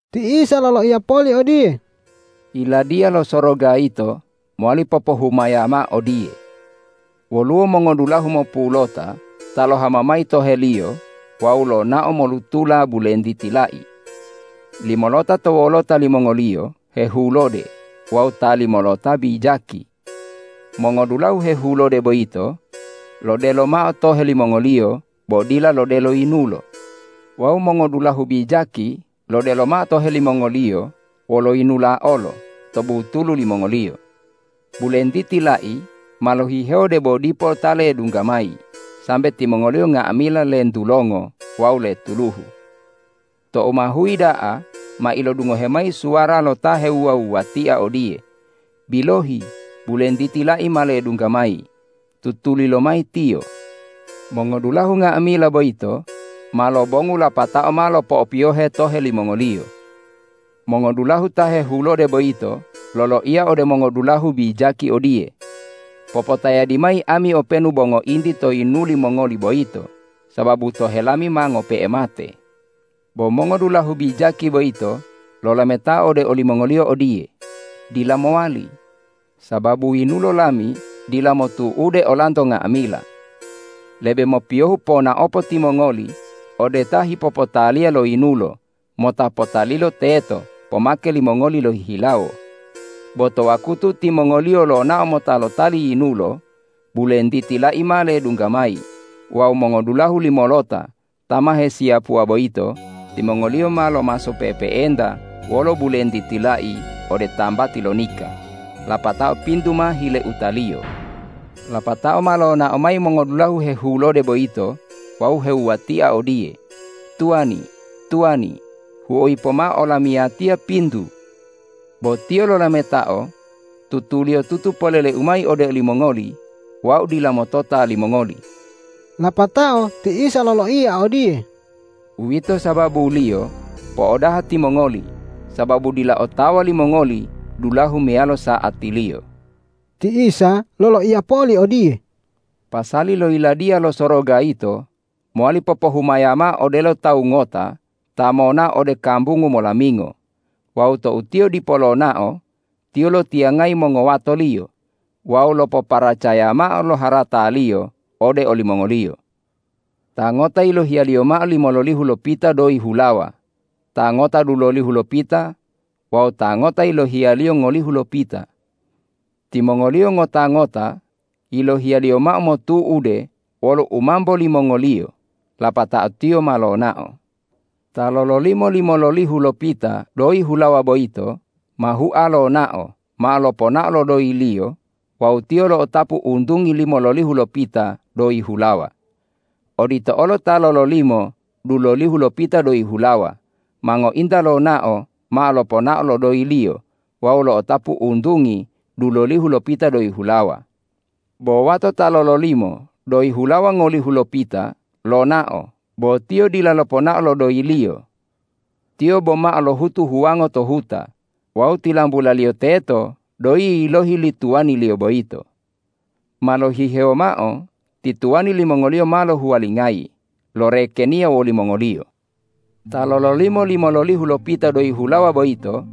Ti Isa loloiya poli odiye,”Yiladiya lo Soroga yito mowali popohumaya mao odiye: Woluwo mongodulahu mopulota ta lohama mayi toheliyo wawu lonao molutula bulentiti lai. Limolota to wolota limongoliyo hehulode wawu ta limolota bijaki. Mongodulahu hehulode boyito lodelo mao tohe limongoliyo bo dila lodelo yinulo wawu mongodulahu bijaki lodelo mao tohe limongoliyo wolo yinula olo to butulu limongoliyo. Bulentiti lai ma lohihewo debo dipo ta ledungga mayi sambe timongoliyo nga'amila lentulongo wawu letuluhu. Tou ma huyi da'a ma ilodungohe mayi suwara lo ta hewuwatia odiye, ’Bilohi, bulentiti lai ma ledungga mayi, tutuli lomayi tiyo!’ Mongodulahu nga'amila boyito ma lobongu lapatao ma lopo'opiyohe tohe limongoliyo. Mongodulahu ta hehulode boyito loloiya ode mongodulahu bijaki odiye, ’Popotayadi mayi ami openu bo ngointi to yinuli mongoli boyito, sababu tohe lami ma ngope'e mate.’ Bo mongodulahu bijaki boyito lolametao ode olimongoliyo odiye, ’Dila mowali, sababu yinulo lami dila motu'ude olanto nga'amila. Lebe mopiyohu ponaopo timongoli ode ta hipopotaliya lo yinulo mota potalilo teto pomake limongoli lohihilawo.’ Bo to wakutu timongoliyo lonao mota lotali yinulo, bulentiti lai ma ledungga mayi wawu mongodulahu limolota ta ma hesiyapuwa boyito, timongoliyo ma lomaso pe'epe'enta wolo bulentiti lai ode tambati lo nika, lapatao pintu ma hileutaliyo. Lapatao ma lonao mayi mongodulahu hehulode boyito wawu hewuwatia odiye, ’Tuwani, tuwani, huoyi pomao olamiyatiya pintu!’ Bo tiyo lolametao, ’Tutuliyotutu poleleu mayi olimongoli, wau dila motota limongoli.’” Lapatao ti Isa loloiya odiye,”Uwito sababuliyo po'odaha timongoli sababu dila otawa limongoli dulahu meyalo sa'atiliyo.” Ti Isa loloiya poli odiye,”Pasali lo Yiladiya lo Soroga yito mowali popohumaya mao odelo tawu ngota ta monao ode kambungu molamingo wawu tou tiyo dipo lonao, tiyo lotiyangayi mongowatoliyo wawu lopoparacaya mao lo harataliyo ode olimongoliyo. Ta ngota yilohiyaliyo mao limololihu lopita doyi hulawa, ta ngota dulolihu lopita wawu ta ngota yilohiyaliyo ngolihu lopita. Timongoliyo ngota-ngota yilohiyaliyo mao motu'ude wolo u mambo limongoliyo, lapatao tiyo ma lonao. Ta lololimo limololihu lopita doyi hulawa boyito ma hua lonao mao loponao lo doyiliyo wawu tiyo lo'otapu untungi limololihu lopita doyi hulawa. Odito olo ta lololimo dulolihu lopita doyi hulawa ma ngointa lonao mao loponao lo doyiliyo wawu lo'otapu untungi dulolihu lopita doyi hulawa. Bo wato ta lololimo doyi hulawa ngolihu lopita lonao bo tiyo dila loponao lo doyiliyo. Tiyo bomao lohutu huwango to huta wawu tilambulaliyo teto doyi yilohi li tuwaniliyo boyito. Ma lohihewo mao ti tuwani limongoliyo ma lohuwalingayi lorekeniya wolimongoliyo. Ta lololimo limololihu lopita doyi hulawa boyito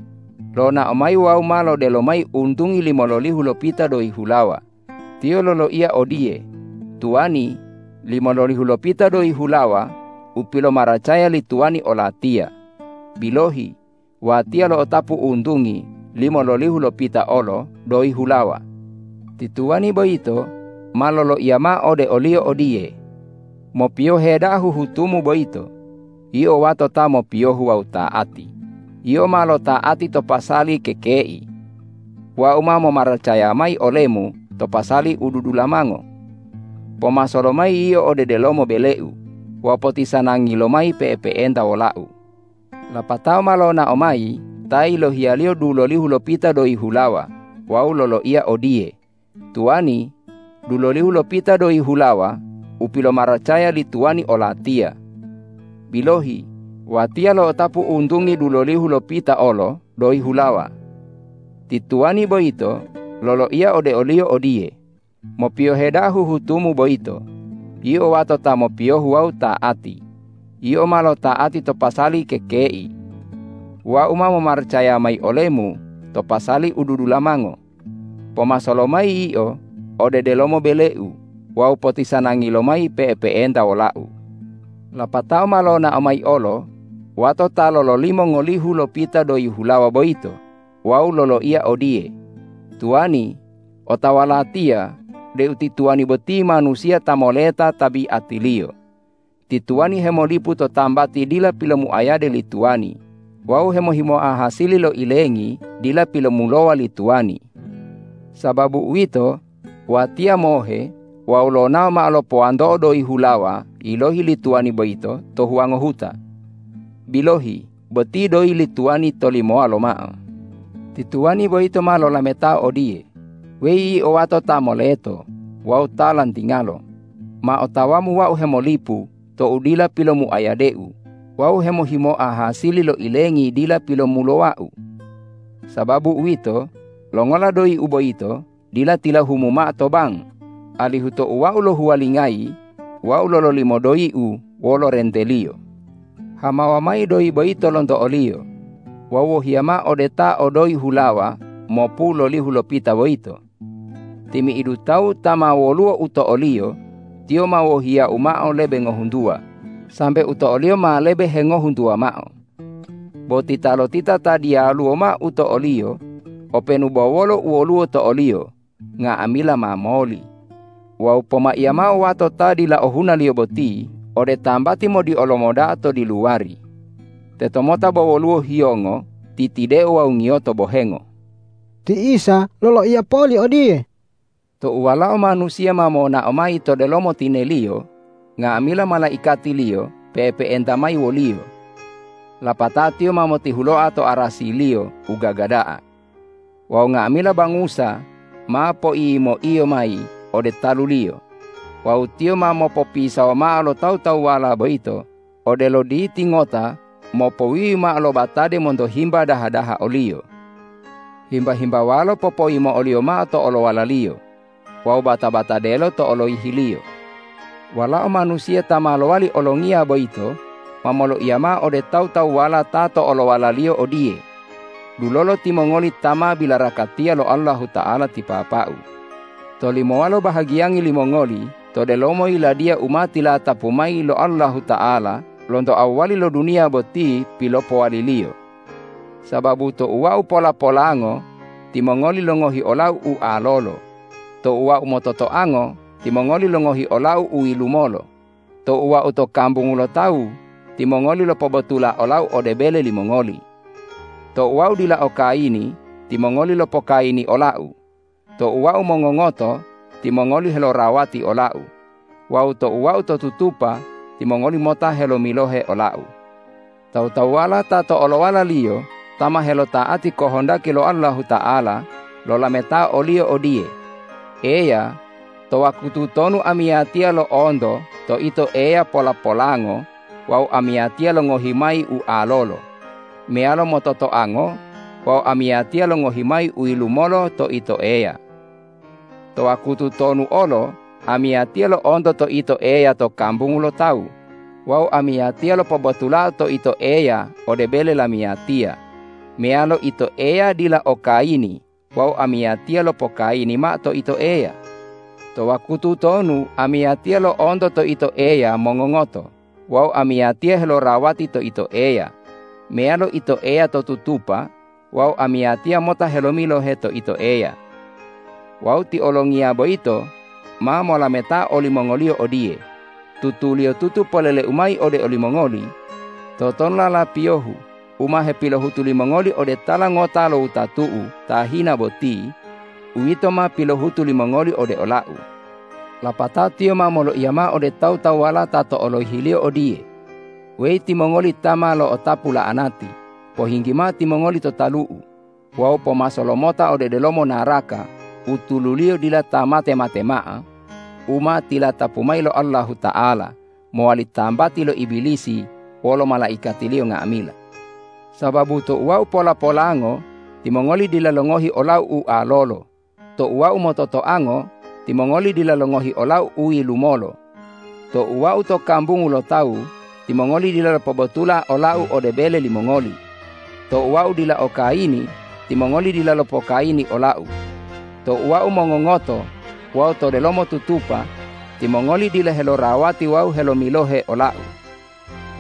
lonao mayi wawu ma lodelo mayi untungi limololihu lopita doyi hulawa, tiyo loloiya odiye, ’Tuwani, limololihu lopita doyi hulawa u pilomaracaya li tuwani olatiya. Bilohi, watiya lo'otapu untungi limololihu lopita olo doyi hulawa.’ Ti tuwani boyito ma loloiya mao ode oliyo odiye, ’Mopiyohe da'a huhutumu boyito, yio wato ta mopiyohu wawu ta'ati; yio ma lota'ati to pasali kekei. Wau ma momaracaya mayi olemu to pasali u dudulamango. Pomaso lomayi yio ode delomo beleu wawu potisanangi lomayi pe'epe'enta wolau.’ Lapatao ma lonao mayi ta yilohiyaliyo dulolihu lopita doyi hulawa wawu loloiya odiye, ’Tuwani, dulolihu lopita doyi hulawa u pilomaracaya li tuwani olatiya. Bilohi, watiya lo'otapu untungi dulolihu lopita olo doyi hulawa.’ Ti tuwani boyito loloiya ode oliyo odiye, ’Mopiyohe da'a huhutumu boyito, yio wato ta mopiyohu wawu ta'ati; yio ma lota'ati to pasali kekei. Wau ma momaracaya mayi olemu to pasali u dudulamango. Pomaso lomayi yio ode delomo beleu wawu potisanangi lomayi pe'epe'enta wolau.’ Lapatao ma lonao mayi olo wato ta lololimo ngolihu lopita doyi hulawa boyito wawu loloiya odiye, ’Tuwani, otawa latiya deu ti tuwani boti manusiya ta moleta tabiatiliyo. Ti tuwani hemolipu to tambati dila pilomuayade li tuwani wawu hemohimoa hasili lo ilengi dila pilomulowa li tuwani. Sababu uwito, watiya mohe wawu lonao mao lopowanto'o doyi hulawa yilohi li tuwani boyito to huwango huta. Bilohi boti doyi li tuwani tolimowa lomao.’ Ti tuwani boyito ma lolametao odiye, ’Weyi yio wato ta moleto wawu ta lantingalo, ma otawamu wau hemolipu tou dila pilopomuayadeu wawu hemohimoa hasili lo ilengi dila pilomulowau. Sababu uwito, longola doyiu boyito dila tilahumu mao to bang, alihu tou wau lohuwalingayi wau lololimo doyiu wolo renteliyo? Hamawa mayi doyi boyito lonto oliyo wawu wohiya mao de ta o doyi hulawa mopulolihu lopita boyito. Timi'idu tawu ta ma woluwo u to oliyo, tiyo ma wohiyau mao lebe ngohuntuwa sambe u to oliyo ma lebe hengohuntuwa mao. Bo titalotita ta diyaluwo mao u to oliyo, openu bo wolo u woluwo to oliyo nga'amila ma moli. Wawu pomaiya mao wato ta dila ohunaliyo boti ode tambati modiolomo da'a to diluwari. Tetomota bo woluwo hiyongo, titideo wawu ngiyoto bohengo.’” Ti Isa loloiya poli odiye,”Tou Walao Manusiya ma monao mayi to delomo tine-Liyo, nga'amila malaikati-Liyo pe'epe'enta mayi wo-Liyo. Lapatao Tiyo ma motihuloa to arasi-Liyo u gaga da'a. Wawu nga'amila bangusa ma poiyimo-Iyo mayi ode talu-Liyo wawu Tiyo ma mopopisawo mao lo tawu-tawuwala boyito odelo diti ngota mopowiwi mao lo batade monto himba daha-daha o-Liyo. Himba-himbawalo popoyimo'o-Liyo mao to olowala-Liyo wawu bata-batadelo to oloyihi-Liyo. Walao Manusiya ta ma lowali Olongiya boyito ma moloiya mao ode tawu-tawuwala ta to olowala-Liyo odiye, ’Dulolo timongoli ta ma bilarakatiya lo Allahuta'ala ti Papa-U, tolimowalo bahagiyangi limongoli to delomo Yiladiya u ma tilatapu mayi lo Allahuta'ala lonto awwali lo duniya boti pilopowali-Liyo. Sababu tou Wau pola-polango, timongoli longohi ola-U ualolo; tou Wau mototoango, timongoli longohi ola-U uyilumolo; tou Wau to kambungu lo tawu, timongoli lopobotula ola-U ode bele limongoli. Tou Wau dila okayini, timongoli lopokayini ola-U; tou Wau mongongoto, timongoli helorawati ola-U; wawu tou Wau to tutupa, timongoli mota helomilohe ola-U.’ Tawu-tawuwala ta to olowala-Liyo ta ma helota'ati kohondaki lo Allahuta'ala, lolametao o-Liyo odiye, ’Eya, to wakutu tonu amiyatiya lo'onto to Ito Eya pola-polango wawu amiyatiya longohi mayi ualolo, meyalo mototoango wawu amiyatiya longohi mayi uyilumolo to Ito Eya? To wakutu tonu olo amiyatiya lo'onto to Ito Eya to kambungu lo tawu wawu amiyatiya lopobotulao to Ito Eya ode bele lamiyatiya, meyalo Ito Eya dila okayini wawu amiyatiya lopokayini mao to Ito Eya? To wakutu tonu amiyatiya lo'onto to Ito Eya mongongoto wawu amiyatiya helorawati to Ito Eya, meyalo Ito Eya to tutupa wawu amiyatiya mota helomilohe to Ito Eya?’ Wawu ti Olongiya boyito ma molametao olimongoliyo odiye, ’Tutuliyotutu polele-U mayi ode olimongoli: Totonulala piyohu u ma hepilohutu limongoli ode tala ngota lo wutatu-U ta hina boti, uwito ma pilohutu limongoli ode ola-U.’ Lapatao Tiyo ma moloiya mao ode tawu-tawuwala ta to oloyihi-Liyo odiye, ’Weyi timongoli ta ma lo'otapu la'anati, pohinggi mao timongoli to talu-U wawu pomaso lomota ode delomo naraka u tululiyo dila ta mate-mate mao u ma tilatapu mayi lo Allahuta'ala mowali tambati lo Ibilisi wolo malaikatiliyo nga'amila. Sababu tou Wau pola-polango, timongoli dila longohi ola-U ualolo; tou Wau mototoango, timongoli dila longohi ola-U uyilumolo; tou Wau to kambungu lo tawu, timongoli dila lopobotula ola-U ode bele limongoli; tou Wau dila okayini, timongoli dila lopokayini ola-U; tou Wau mongongoto wawu to delomo tutupa, timongoli dila helorawati wawu helomilohe ola-U.’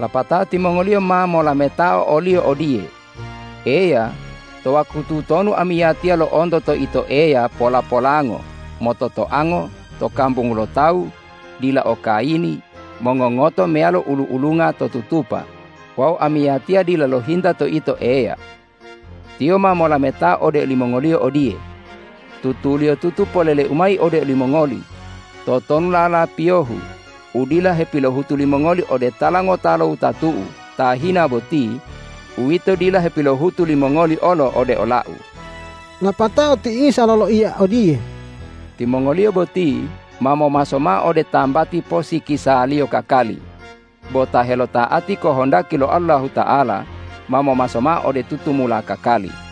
Lapatao timongoliyo ma molametao o-Liyo odiye, ’Eya, to wakutu tonu amiyatiya lo'onto to Ito Eya pola-polango, mototoango, to kambungu lo tawu, dila okayini, mongongoto meyalo ulu-ulunga to tutupa wawu amiyatiya dila lohinta to Ito Eya?’ Tiyo ma molametao olimongoliyo odiye, ’Tutuliyotutu polele-U mayi ode olimongoli: Totonulala piyohu u dila hepilohutu limongoli ode tala ngota lo wutatu-U ta hina boti, uwito dila hepilohutu limongoli olo ode ola-U.’” Lapatao ti Isa loloiya odiye,”Timongoliyo boti ma momaso mao ode tambati posikisaliyo kakali, bo ta helota'ati kohondaki lo Allahuta'ala ma momaso mao ode tutumula kakali.”